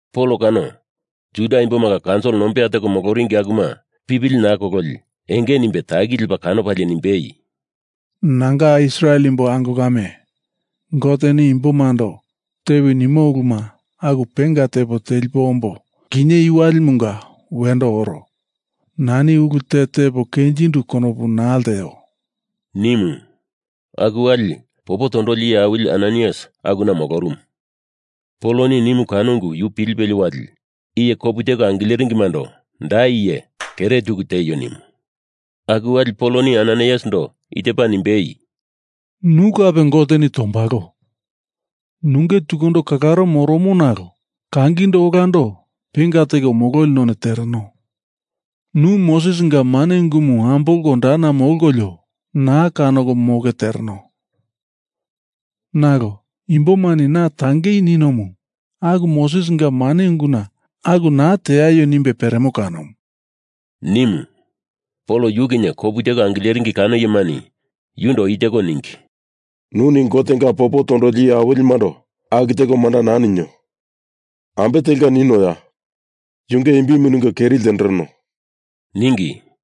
Pol kano Juda imbomanga kaunsil nombeya teko moloringi akuma pipili naa kololi enge nimbe taki lepa kanopalie nimbei, “Nanga Israel imbo ango kame, Goteni imbomando tewi nimo uluma aku penga tepo telipo ombo kinye i walimunga wendo oro. Nani ulu te tepo kenjindu konopu naa lteo,” nimu. Aku wali popo tondoli iye awili Ananaias akuna molorumu. Poloni nimu kano ungu yuni pilipelie wali iye kopu teko angileringimando da iye kere tuku tieio nimu. Aku wali Poloni Ananaiasindo i tepa nimbei, “Nu kape Goteni tombalo. Nunge tukundo kalaro moromo nalo kangindo olando penga teko mololi none tereno. Nu Mosesinga mane ungumu ambolko dana molkolio na kanoko moke tereno. Nalo imbomani na tangei ninomu aku Mosesinga mane unguna aku naa teaio nimbe peremo kanomu,” nimu. Pol yu kinye kopu teko angileringi kano iyemani yundo i teko ningi, “Nuni Gotenga popo tondoli iye awilimundo aku teko manda naa nino. Ambe telka ninoya? Yunge imbimu ningo keri ltendereno,” ningi.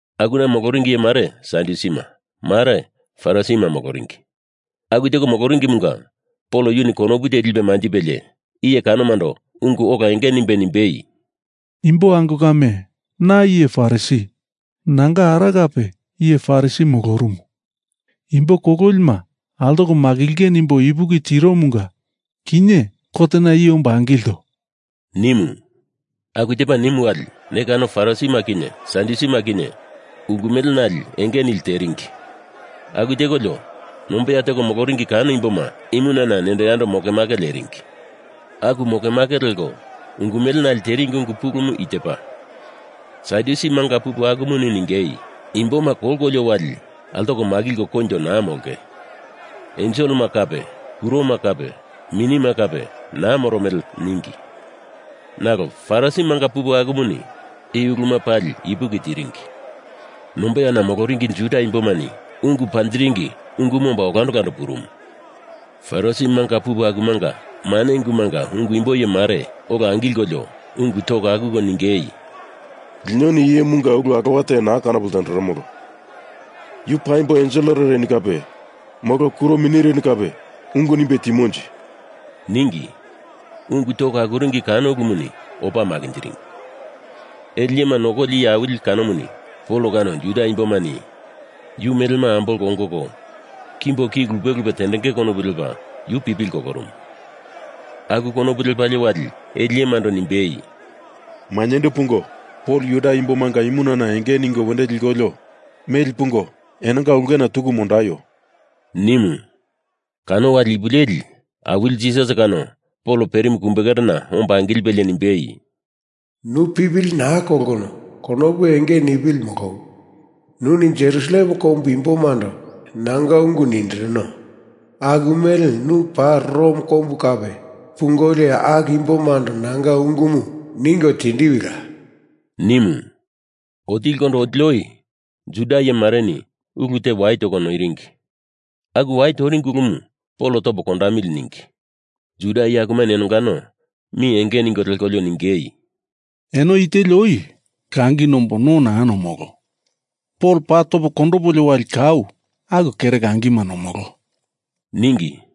Akuna moloringi iye mare Sadyusima, mare Farisima moloringi. Aku teko moloringimunga Pol yuni konopu te lipe manjipelie iye kanomando ungu ola enge nimbe nimbei, “Imbo ango kame, na iye Farisi. Nanga ara kape iye Farisi molorumu. Imbo kololima altoko makilinge nimbo ipuki tiromunga kinye kotena i ombo angilto,” nimu. Aku tepa nimu wali, ne kano Farisima kinye Sadyusima kinye ungu melenale enge nili teringi. Aku tekolio nombeya teko moloringi kano imboma imunana nendo yando mokemake leringi. Aku mokemake leko ungu melenale teringi ungu pulumu i tepa, Sadyusi manga pupu akumuni ningei, “Imboma kolkolio wali altoko makilko koinjo naa molonge. Enselema kape kuroma kape minima kape naa moromele,” ningi. Nalo Farisi manga pupu akumuni i uluma pali ipuki tiringi. Nombeyana moloringi Juda imbomani ungu panjiringi ungumu omba olando olando purumu. Farisi manga pupu akumunga mane ungumunga ungu imbo iye mare ola angilkolio ungu toko akuko ningei, “Linoni iye imunga ulu alowa te naa kanopo ltenderemolo. Yu paimbo enselereni kape molo kuro minireni kape ungu nimbe timonje,” ningi. Ungu toko akuringi kano ulumuni opa makinjiringi. Ele iyema nokoli iye awili kanomuni Pol kano Juda imbomani yu melema ambolko ongoko kimbo ki lupe lupe tendenge konopu lepa yu pipili kolorumu. Aku konopu lepalie wali ele iyemando nimbei, “Mainyendo pungo Pol Juda imbomanga imunana enge ningo wendo likolio meli pungo enonga ulkena tuku mondaio,” nimu. Kano wali ipu leli Awili Jisas kano Pol perimu kumbekerena omba angilipelie nimbei, “Nu pipili naa kolkono konopu enge nipili molowi. Nuni Jerusalem kombu imbomando nanga ungu nindirino. Aku mele nu paa Rom kombu kape pungolio aku imbomando nanga ungumu ningo tindiwila,” nimu. Otilikondo otili oi Juda iyemareni ulu te wai toko noiringi. Aku wai toringi ulumu Pol topo kondamili ningi. Juda iye akumani enongano mi enge ningo lekolio ningei, “Eno i teli oi langi nombo no naa nomolo. Pol paa topo kondopolio wali kau aku kere langima nomolo,” ningi.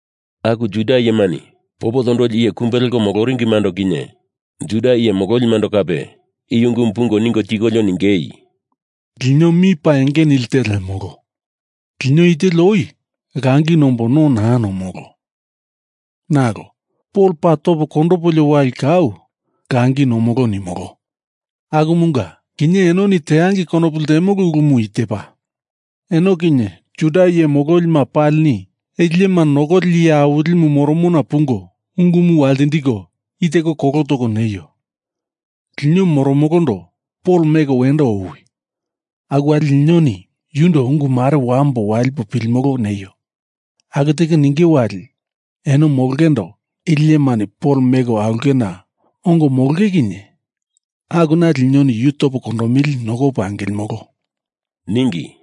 Aku Juda iyemani popo tondoli iye kumbe leko moloringimando kinye Juda iye mololimando kape i ungumu pungo ningo tikolio ningei, “Lino mi paa enge nilte lemolo. Lino i teli oi langi nombo no naa nomolo. Nalo Pol paa topo kondopolio wali kau langi nomolo nimolo. Akumunga kinye enoni tendangei konopu ltemolo ulumu i tepa: Eno kinye Juda iye mololima palini ele iyema nokoli iye awilimu moromona pungo ungumu waltindiko i teko kolo toko neio, lino moromolondo Pol meko wendo owi. Aku wali linoni yundo ungu mare wambo walipo pilimolo neio. Aku teko ninge wali eno molongeindo ele iyemani Pol meko aulkena ongo molonge kinye akuna linoni yu topo kondomili nokopo angilimolo,” ningi.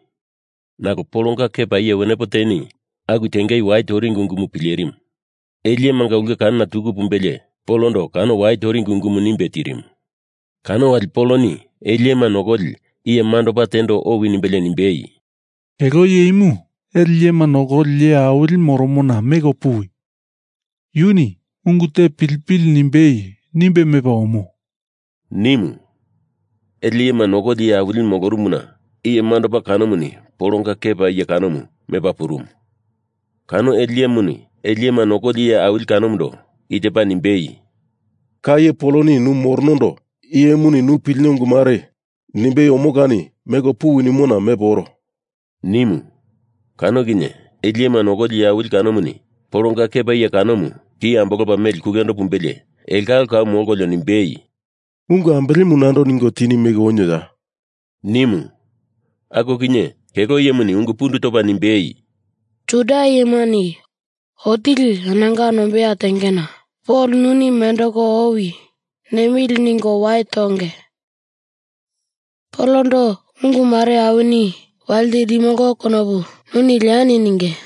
Nalo Polonga kepa iye wenepo teni aku tengei wai toringi ungumu pilerimu. Ele iyemanga ulke kanona tuku pumbelie Polondo kano wai toringi ungumu nimbe tirimu. Kano wali Poloni ele iyema nokoli iye mandopa tendo owi nimbelie nimbei, “Kelo iye imu ele iyema nokoli iye awilimu moromona meko puwi. Yuni ungu te pilipili nimbei nimbe mepa omo,” nimu. Ele iyema nokoli iye awilimu molorumuna iye mandopa kanomuni Polonga kepa iye kanomu mepa purumu. Kano ele iyemuni ele iyema nokoli iye awili kanomundo i tepa nimbei, “Ka iye Poloni nu moronondo iye imuni nu pilino ungu mare nimbei omo kani meko puwi nimona mepo oro,” nimu. Kano kinye ele iyema nokoli iye awili kanomuni Polonga kepa iye kanomu ki ambolopa meli kulendo pumbelie elongalo kau molkolio nimbei, “Ungu ambelemu nando ningo tini meko onioya?” nimu. Aku kinye kelo iyemuni ungu pundu topa nimbei, “Juda iyemani otili enonga nombeya tengena Pol nuni mendeko owi nemili ningo wai tonge. Polondo ungu mare awini waltindimolo konopu nuni leani ninge.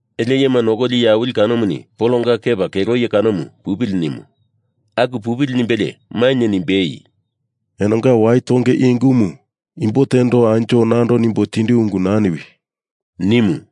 Ele iyema nokoli iye awili kanomuni Polonga kepa kelo iye kanomu pupili nimu. Aku pupili nimbelie mainye nimbei, “Enonga wai tonge i ungumu imbo tendo anjo nando nimbo tindu ungu naa niwi,” nimu.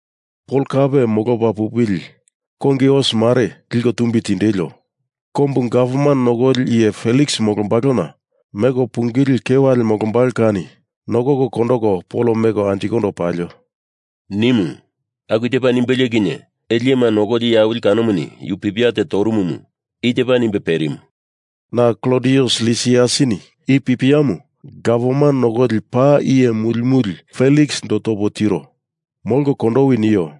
Pol kape molopa pupili kongi os mare liko tumbi tindelio. Kombu gavman nokoli iye Feliks molombalona meko pungili kewale molombalo kani nokoko kondoko Pol meko anjikondo palio,” nimu. Aku tepa nimbelie kinye ele iyema nokoli iye awili kanomu yuni pipia te torumumu i tepa nimbe perimu; “Na Klodius Lisiasini i pipiamu gavman nokoli paa iye muli muli Feliksindo topo tiro. Molko kondowi, nio.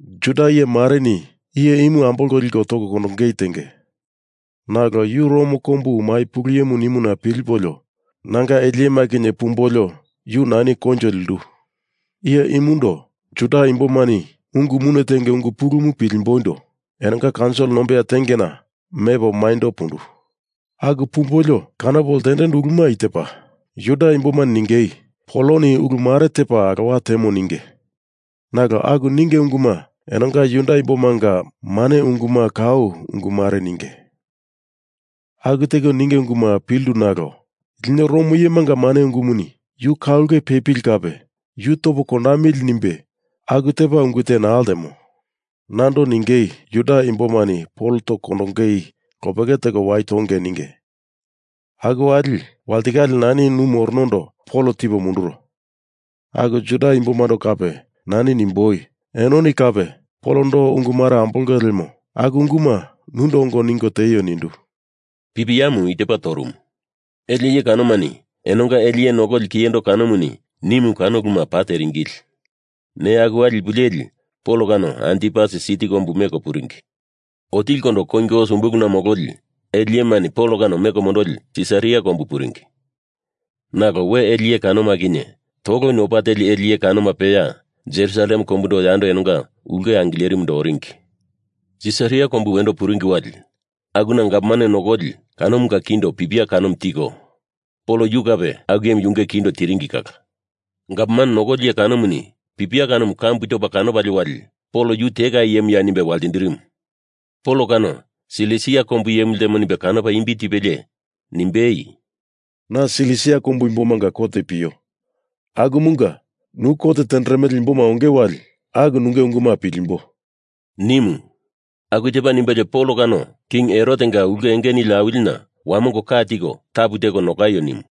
Juda iyemareni iye imu ambolko liko toko kondongei tenge. Nalo yu Rom kombu mai pulu iye nimuna pilipolio nanga ele iyema kinye pumbolio yu nani koinjo lindu. Iye imundo Juda imbomani ungu mune tenge ungu pulumu pilimboindo enonga kaunsil nombeya tengena mepo maindo pundu. Aku pumbolio kanopo ltendendu uluma i tepa: Juda imbomani ningei Poloni ulu mare tepa alowa temo ninge. Nalo aku ninge unguma enonga Juda imbomanga mane unguma kau ungu mare ninge. Aku teko ninge unguma pilindu nalo lino Rom iyemanga mane ungumuni yu ka ulke pepili kape yu topo kondamili nimbe aku tepa ungu te naa ltemo. Nando ningei Juda imbomani Pol toko kondongei lopeke teko wai tonge ninge. Aku wali walitikale nani nu moronondo Pol tipo munduro. Aku Juda imbomando kape nani nimboi, enoni kape Polondo ungu mare ambolonge lemo aku unguma nundo ongo ningo tieio nindu,” pipiamu i tepa torumu. Ele iye kanomani enonga ele iye nokoli kiyendo kanomuni nimu kano uluma paa teringili. Neya aku wali ipu leli Pol kano Antipasi siti kombu meko puringi. Otilikondo kongi os umbuluna mololi ele iyemani Pol kano meko mondoli Sisaria kombu puringi. Nalo we ele iye kanoma kinye toloni opa teli ele iye kanoma peya Jerusalem kombundo yando enonga ulke angilerimundo oringi. Sisaria kombu wendo puringi wali, akuna gavman nokoli iye kanomunga kindo pipia kanomu tiko, Pol yu kape aku iyemu yunge kindo tiringi kala. Gavman nokoli iye kanomuni pipia kanomu kambu topa kanopalie wali Pol nu tekai iyemuya nimbe waltindirimu. Pol kano Silisia kombu iyemu ltemo nimbe kanopa imbi tipelie, nimbei, “Na Silisia kombu imbomanga kot pio. Akumunga nu kot tenderemele imboma onge wali aku nunge unguma pilimbo,” nimu. Aku tepa nimbelie Pol kano king Herotenga ulke enge nili awilina wamongo ka tiko tapu teko nokaio nimu.